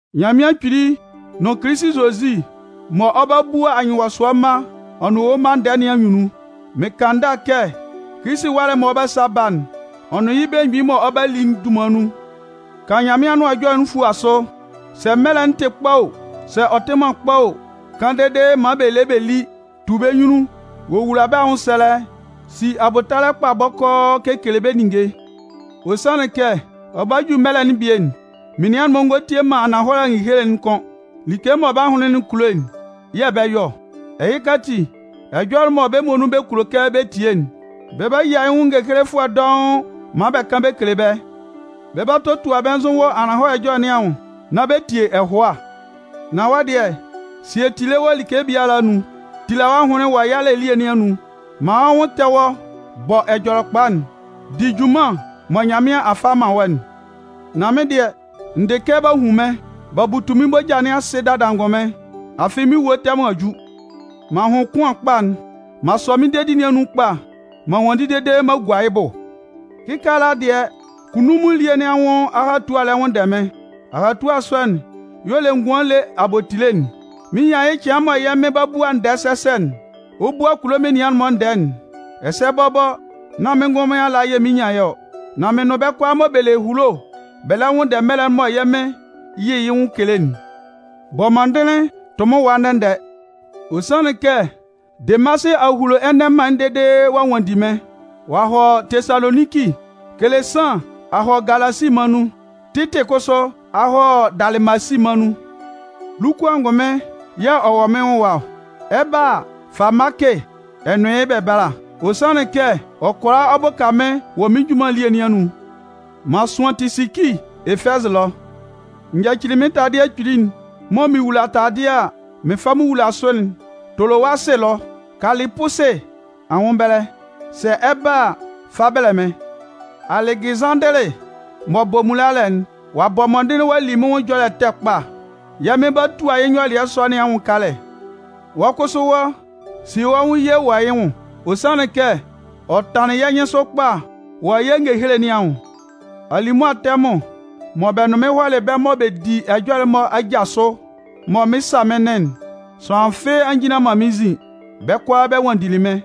Nyanmɩan Kpili nʋn Kilisi Zozi mɔ ɔ 'ba bua anyɩnwɔsʋɛ mma ɔ nʋn ewue mma ndɛɛ nɩn anyunnun, mɩn kan ndâ kɛ Kilisi ɛwalɛ'n mɔ ɔ 'ba sa ba'n, ɔ nʋn yɩ́ belemgbin mɔ ɔ 'ba li'n dunman nun, kan Nyanmɩan Anʋan Ɛjɔlɛ fua sʋ, sɛ mɛlɛ'n tɩ kpa o, sɛ ɔ tɩ man kpa o, kan dede maan bɛ lé bɛ lí, tu bɛ́ nyunnun, wowula bɛ́ anwʋnsɛlɛ, si abʋtalɛ kpa bɔkɔɔ kekele bɛ́ ninnge. Ɔ sanlɩn kɛ, ɔ 'ba ju mɛlɛ'n bie'n, menian'n-mɔ ngɔ tie man ananhɔlɛ ngehele'n kʋ́n. Like mɔ bɛ́ ahʋnlɩn'n kulo'n yɛ̂ bɛ 'yɔ ɔ. Ɛhɩka ati, ɛjɔlɛ mɔ bɛ́ muonun bɛ kulo kɛ bɛ tie'n, bɛ 'ba yia yɩ́ nwʋn ngehelefʋɛ dɔʋn maan bɛ kan bɛ kele bɛ́. Bɛ 'ba totua bɛ́ nzʋ wɔ ananhɔlɛ ɛjɔlɛ nɩn anwʋn nán bɛ tie ɛhʋa. Nan wɔ́ dɩɛ, sie tile wɔ like biala anun, tila wɔ́ ahʋnlɩn wɔ yalɛ elie nɩn anun, man wɔ́ nwʋn tɛ wɔ́ bɔ Ɛjɔlɛkpa'n, di junman mɔ Nyanmɩan a fa a man wɔ́'n. Nan mɩ́n dɩɛ, n dɩ kɛ b'a hun mɩ́n, b'a butu mɩ́n moja nɩn asɩ dada angʋnmɩn. Afɩ mɩ́n ewue tɛmʋn a ju. M'an hʋn kʋan kpa'n. M'an sɔ mɩ́n dedi nɩn anun kpa, m'an nwanndi dede m'an gua yɩ́ bʋ. Kɩkaala dɩɛ, kunnunmun elie nɩn anwʋn ahatua lɛ nwʋnndɛ mɩ́n. Ahatua sɔ'n y'ɔ le ngʋan ele abotile'n. Mɩn 'nyan yɩ́ cɩan mɔ yɛ́ Mɩn m'ɔ bua ndɛɛ sɛsɛ'n, ɔ 'bua kulo menian'n-mɔ ndɛɛ'n. Ɛsɛ bɔbɔ, nan mɩ́n ngʋnmɩn ala yɛ̂ mɩn 'nyan yɩ́ ɔ, nan mɩn nʋn bɛ́ kʋalaa mɔ bɛ le ehulo bɛ lɛ nwʋnndɛ mɛlɛ'n mɔ yɛ́ Mɩn 'yɩ yɩ́ nwʋn kele'n. Bɔ mɔndɩnlɩn tʋ mɩ́n ɛwa ndɛ-ndɛ. Ɔ sanlɩn kɛ Demasɩ a hulo ɛnɛ mân'n dede ɔ'a nwanndi mɩ́n. Ɔ'a hɔ Tesaloninki. Kelesan a hɔ Galasi mân nun, Titɩ kʋsʋ a hɔ Dalɩmasi mân nun. Luku angʋnmɩn yɛ̂ ɔ wɔ mɩ́n nwʋn ɛwa ɔ. Ɛ 'ba a, fa Maakɩ ɛ nʋn yɩ́ bɛ bála. Ɔ sanlɩn kɛ ɔ kʋala ɔ bʋka mɩ́n wɔ mɩ́n junman elie nɩn anun. M'an sʋan Tisiki Efɛzɩ ɛlɔ. N yacili mɩ́n taladɩɛ kpili'n mɔ mɩn wula taladɩɛ a, mɩn fa mɩn wula sʋ'n Tolowasɩ ɛlɔ, Kalɩpusɩ anwʋn ɛbɛlɛ. Sɛ ɛ 'ba a, fa bɛlɛ mɩ́n. Alɛgɩzanndɩlɩ m'ɔ bɔ mmulalɛ'n, ɔ'a bɔ mɔndɩnlɩn ɔ'a li mɩ́n nwʋn ɛjɔlɛ ɛtɛ kpa. Yɛ́ Mɩn 'ba tua yɩ́ nyɔlɩɛ sɔ nɩn anwʋn kalɛ. Wɔ́ kʋsʋ wɔ́, sie wɔ́ nwʋn ye wɔ yɩ́ nwʋn. Ɔ sanlɩn kɛ, ɔ tanlɩn yɛ́ nyɩnsʋ kpa wɔ yɛ́ ngehele nɩn anwʋn. Alimʋa tɛmʋn mɔ bɛ nʋn mɩ́n hɔlɩ bɛ́ mɔ bɔ di ɛjɔlɛ'n-mɔ aja sʋ, mɔ mɩn 'sa mɩ́n nɩn'n, sʋanlan fɩ́ɩ́ a njinlan man mɩ́n nzin. Bɛ́ kʋalaa bɛ nwanndili mɩ́n.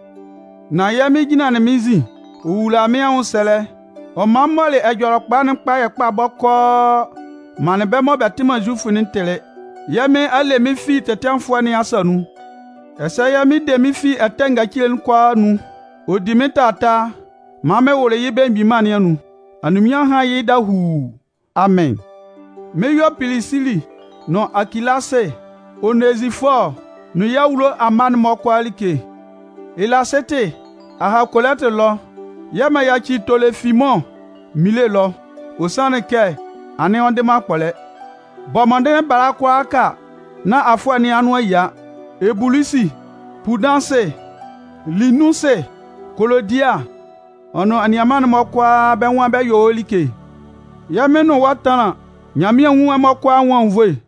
Nan yɛ́ Mɩn jinlanlɩn mɩ́n nzin, ɔ wulalɩ mɩ́n anwʋnsɛlɛ, ɔ man m mɔlɩ Ɛjɔlɛkpa'n kpayɛ kpa bɔkɔɔ manlɩn bɛ́ kʋalaa mɔ bɛ tɩ man Zufʋ'n tɩlɩ. Yɛ́ Mɩn a le mɩ́n fi tɛtɩanfʋɛ nɩn asa nun. Ɛsɛ yɛ́ Mɩn de mɩ́n fi ɛtɛ ngacile'n kʋalaa anun ɔ di mɩ́n taataa maan mɩn wʋlʋ yɩ́ Belemgbin Mân nɩn anun. Anyunminnyanmʋn hán yɩ́ dahuu. Amɩn. Mɩn 'yɔ Pilisili nʋn Akilasɩ, Onezifɔɔ nʋn yɩ́ awulo amma'n-mɔ kʋalaa like. Elasɩtɩ a ha Kolɩntɩ ɛlɔ yɛ̂ m'an yaci Tolofimʋn Minle ɛlɔ, ɔ sanlɩn kɛ anɩn ɔ ndɩ man akpɔlɛ. Bɔ mɔndɩnlɩn bala kʋalaaka nán afʋɛ nɩn anʋan a yia. Ebulusi, Pudansɩ, Linunsɩ, Kolodia, ɔ nʋn anianman'n-mɔ kʋalaa, bɛ́ nwan bɛ 'yɔ wɔ́ like. Yɛ́ Mɩn nʋn wɔ́ tánlan. Nyanmɩan nwún ɛmɔ kʋalaa anwʋn anwunnvoe.